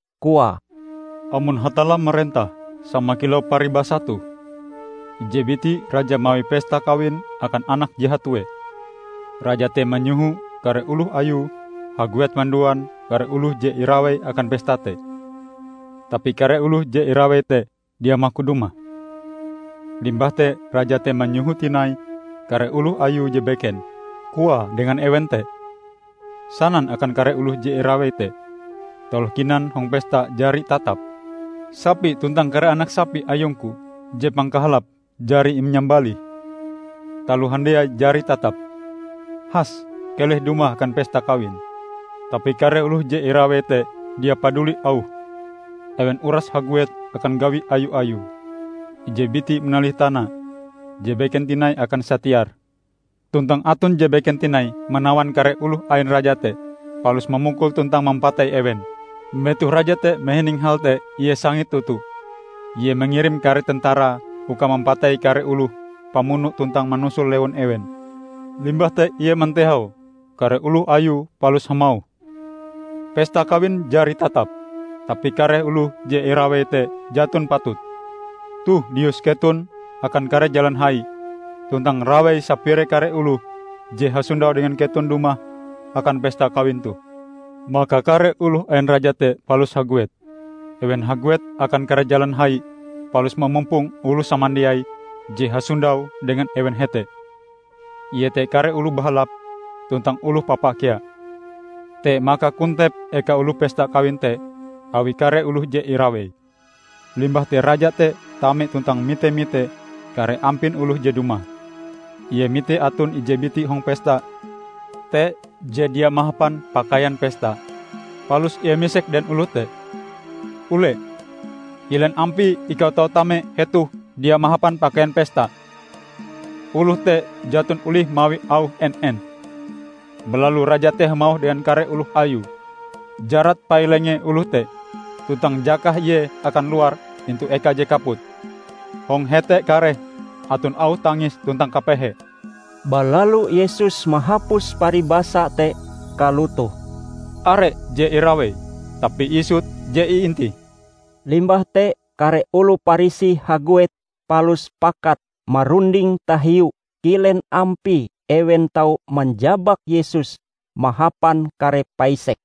koae, "Amon Hatalla marentah sama kilau paribasa toh: Ije biti raja mawi pesta kawin akan anake je hatue. Raja te manyoho kare oloh ayue haguet manduan kare oloh je irawei akan pesta te. Tapi kare oloh je irawei te dia maku dumah. Limbah te raja te manyoho tinai kare oloh ayue je beken. Koae dengan ewen te: 'Sanan akan kare oloh je irawei te: Taloh kinan hong pesta jari tatap. Sapi tuntang kare anak sapi ayungku je pangkahalape jari inyambalih. Taloh handiai jari tatap. Has keleh dumah akan pesta kawin!' Tapi kare oloh je irawei te dia paduli auhe. Ewen uras haguet akan gawi ayu-ayue -- ije biti manalih tanae, je beken tinai akan satiare; tuntang aton je beken tinai manawan kare oloh ain raja te, palus mamukul tuntang mampatei ewen. Metoh raja te mahining hal te ie sangit toto. Ie mangirim kare tentarae uka mampatei kare oloh pamuno tuntang manusul lewun ewen. Limbah te ie mantehau kare oloh ayue palus hamauh, 'Pesta kawin jari tatap, tapi kare oloh je irawei te jaton patut. Toh lius keton akan kare jalan hai, tuntang rawei sapire kare oloh je hasondau dengan keton dumah akan pesta kawin toh.' Maka kare oloh ain raja te palus haguet. Ewen haguet akan kare jalan hai palus mamumpong oloh samandiai je hasondau dengan ewen hete, iete kare oloh bahalap tuntang oloh papa kea. Te maka kontep eka oloh pesta kawin te awi kare oloh je irawei. Limbah te raja te tame tuntang mite-mite kare ampin oloh je dumah. Ie mite aton ije biti hong pesta te je dia mahapan pakaian pesta. Palus ie misek dengan oloh te, 'Ule, kilen ampie ikau tau tame hetoh dia mahapan pakaian pesta?' Oloh te jaton olih mawi auh en-en. Balalu raja te hamauh dengan kare oloh ayue, 'Jarat pai-lengen oloh te, tuntang jakah ie akan luar intu eka je kaput. Hong hete kareh aton auh tangis tuntang kapehe.' " Balalu Yesus mahapus paribasa te kalotoh, "Are je irawei, tapi isut je iintih." Limbah te kare oloh Parisi haguet palus pakat marunding tahiu kilen ampie ewen tau manjabak Yesus mahapan kare paisek.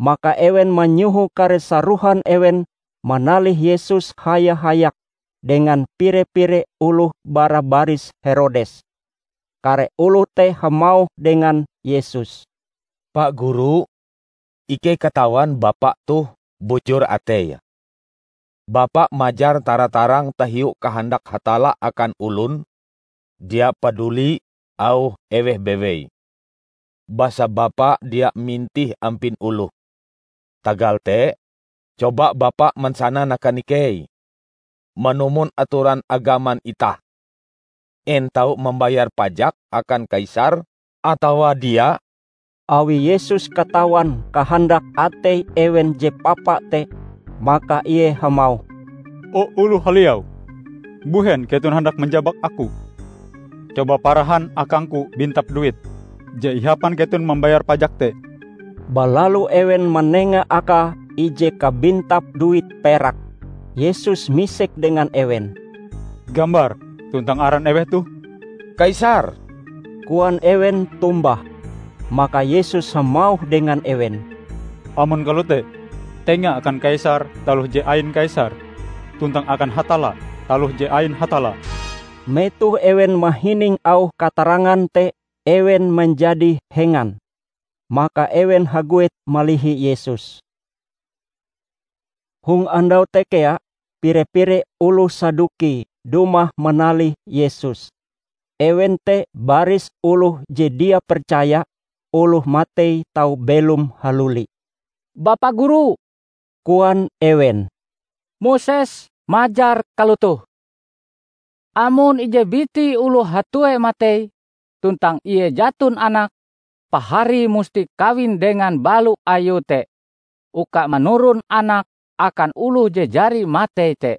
Maka ewen manyoho kare sarohan ewen manalih Yesus haya-hayak dengan pire-pire oloh bara baris Herodes. Kare oloh te hamauh dengan Yesus, "Pa Guru, ikei katawan Bapa toh bujur atei. Bapa majar tara-tarang tahiu kahandak Hatalla akan olon, dia paduli auh eweh bewei. Basa Bapa dia mintih ampin oloh. Tagal te, coba Bapa mansanan akan ikei: Manumon atoran agaman itah, en tau mambayar pajak akan Kaisar atawa dia?" Awi Yesus katawan kahandak atei ewen je papa te, maka ie hamauh, "O, oloh haliau! Mbuhen keton handak manjabak Aku? Coba parahan akangku bintap duit je ihapan keton mambayar pajak te!" Balalu ewen manenga akae ije kabintap duit perak. Yesus misek dengan ewen, "Gambar tuntang aran eweh toh?" "Kaisar," koan ewen tombah. Maka Yesus hamauh dengan ewen, "Amon kalote, tenga akan Kaisar taloh je ain Kaisar, tuntang akan Hatalla taloh je ain Hatalla." Metoh ewen mahining auh katarangan te ewen manjadi hengan. Maka ewen haguet malihi Yesus. Hong andau te kea, pire-pire oloh Saduki dumah manalih Yesus. Ewen te baris oloh je dia percaya oloh matei tau belom haluli. "Bapa Guru," koan ewen, "Moses majar kalotoh: Amon ije biti oloh hatue matei, tuntang ie jaton anake, paharie musti kawin dengan balo ayue te uka manuron anak akan oloh je jari matei te.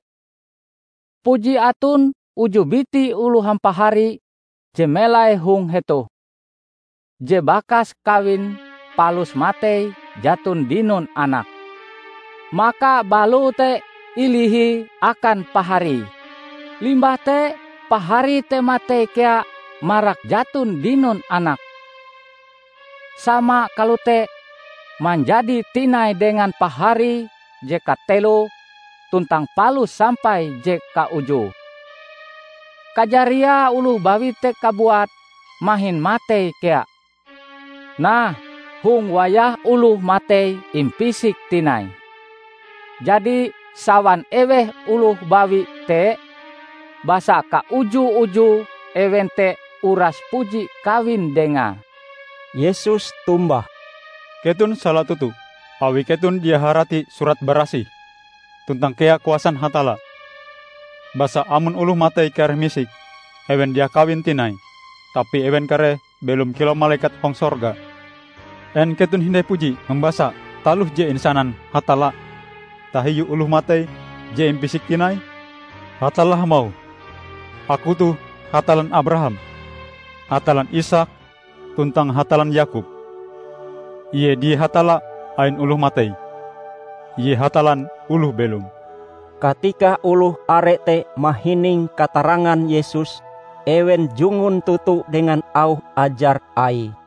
Puji aton uju biti oloh hampahari je melai hong hetoh. Je bakas kawin palus matei jaton dinon anak. Maka baloe te ilihie akan paharie. Limbah te paharie te matei kea marak jaton dinon anak. Sama kalote manjadi tinai dengan paharie je kateloe tuntang palus sampai je kaujue. Kajariae oloh bawi te kabuat mahin matei kea. Nah, hong wayah oloh matei impisik tinai, jadi sawan eweh oloh bawi te? Basa kauju-uju ewen te uras puji kawin dengae." Yesus tombah, "Keton sala toto, awi keton dia harati Surat Barasih, tuntang kea kuasan Hatalla. Basa amon oloh matei kareh misik, ewen dia kawin tinai, tapi ewen kareh belom kilau malekat hong sorga. En keton hindai puji mambasa taloh je insanan Hatalla tahiu oloh matei je impisik tinai? Hatalla hamauh, 'Aku toh Hatallan Abraham, Hatallan Isaak tuntang Hatallan Yakob.' Ie dia Hatalla ain oloh matei. Ie Hatallan oloh belom!" Katika oloh are te mahining katarangan Yesus, ewen jungun toto dengan auh ajar Aie.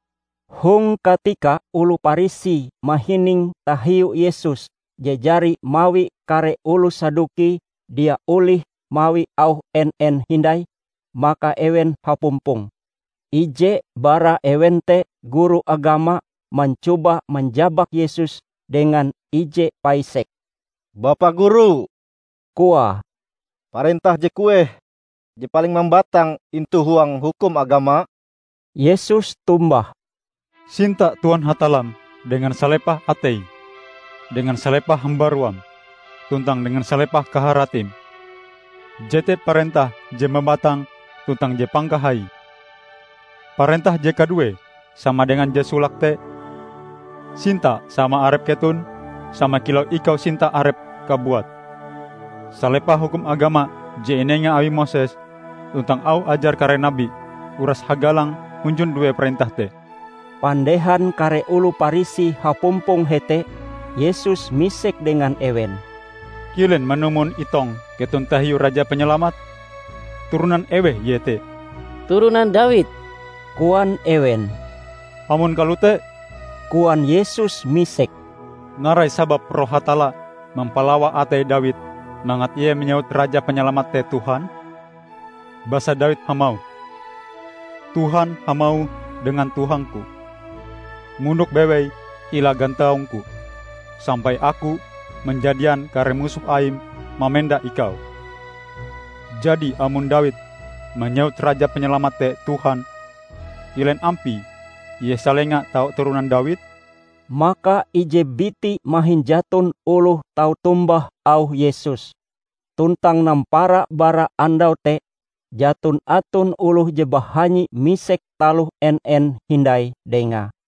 Hong katika oloh Parisi mahining tahiu Yesus je jari mawi kare oloh Saduki dia olih mawi auh en-en hindai, maka ewen hapumpong. Ije bara ewen te guru agama mancoba manjabak Yesus dengan ije paisek. "Bapa guru," koae, "parentah je kueh je paling mambatang intu huang hukum agama?" Yesus tombah, "Sinta Tuhan Hatallam dengan salepah ateim, dengan salepah hambaruam, tuntang dengan salepah kaharatim. Jete parentah je mambatang tuntang je pangkahaie! Parentah je kaduee sama dengan je solake te: Sinta sama arep keton sama kilau ikau sinta arepm kabuat. Salepah hukum agama je inenga awi Moses tuntang auh ajar kare nabi uras hagalang hunjun due parentah te." Pandehan kare oloh Parisi hapumpong hete, Yesus misek dengan ewen, "Kilen manumon itong keton tahiu Raja Panyalamat? Turonan eweh Ie te?" "Turonan Dawid," koan ewen. "Amon kalote," koan Yesus misek, "narai sababe Roh Hatalla mampalawa atei Dawid mangat ie manyewut Raja Panyalamat te 'Tuhan'? Basa Dawid hamauh, 'Tuhan hamauh dengan Tuhang-Ku: mondok bewei hila gantaung-Ku sampai Aku manjadian kare musoh Aim mamenda Ikau.' Jadi amon Dawid manyewut Raja Panyalamat te 'Tuhan', kilen ampie Ie salenga tau turonan Dawid?" Maka ije biti mahin jaton oloh tau tombah auh Yesus. Tuntang nampara bara andau te, jaton aton oloh je bahanyi misek taloh en-en hindai Dengae.